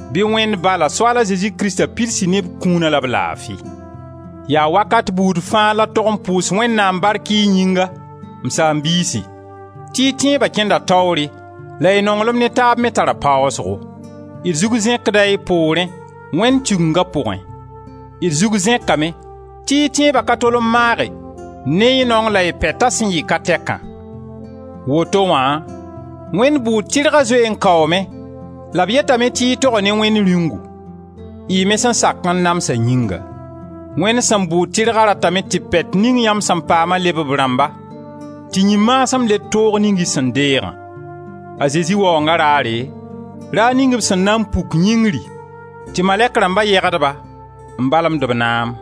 Bɩ Wẽnd Ba la Soaal a Zezi Krista pids-y ne b kũuna la b laafi! Yaa wakat buud fãa la d tog n pʋʋs Wẽnnaam bark y yĩnga, m saam-biisi, tɩ y tẽeba kẽnda taoore la y nonglem ne taab me tara paasgo. D zug zẽkda y poorẽ, Wẽnd Tigenga pʋgẽ. D zug zẽkame tɩ y tẽeba ka tol n maage ne y naong la y pɛta sẽn yɩ ka tɛkã. Woto wã Wẽnd bʋʋd tɩrga zoe n kaoome la b yetame tɩ y toga ne Wẽnd Rĩungu, y me sẽn sak n namsa yĩnga. Wẽnd sẽn bʋʋd tɩrga ratame tɩ pɛt ning yãmb sẽn paama leb b rãmba, tɩ yĩn-maasem led toog ning y sẽn deegã. A Zezi Waoonga raare, raar ning b sẽn na n puk yĩngri, tɩ malɛk rãmba yegd-ba, n balemd b naam.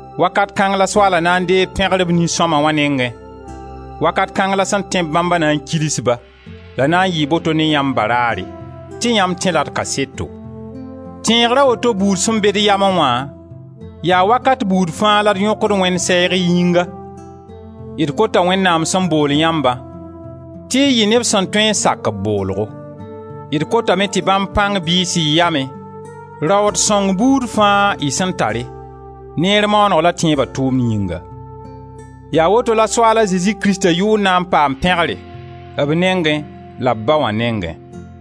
Wakat kãng la Soaala na n deeg pẽgr b nin-sõma wã nengẽ, wakat kãng la sẽn tẽ-b bãmba na n kils-ba — la na n yɩɩ boto ne yãmb baraare. Tɩ yãmb tẽ-la d kaseto. Tẽegra woto buud sẽn be d yamẽ wã, yaa wakat buud fãa la d yõkd Wẽnd sɛɛg y yĩnga. D kota Wẽnnaam sẽn bool yãmbã, tɩ y yɩ neb sẽn tõe n sak b boolgo; d kotame tɩ bãmb pãng bɩɩs y yamẽ raood sõng buud fãa y sẽn tare, neer maaneg la tẽeba tʋʋmd yĩnga. Yaa woto la Soaal a Zezi Krista yʋʋr na n paam pẽgre, b nengẽ la b Ba wã nengẽ.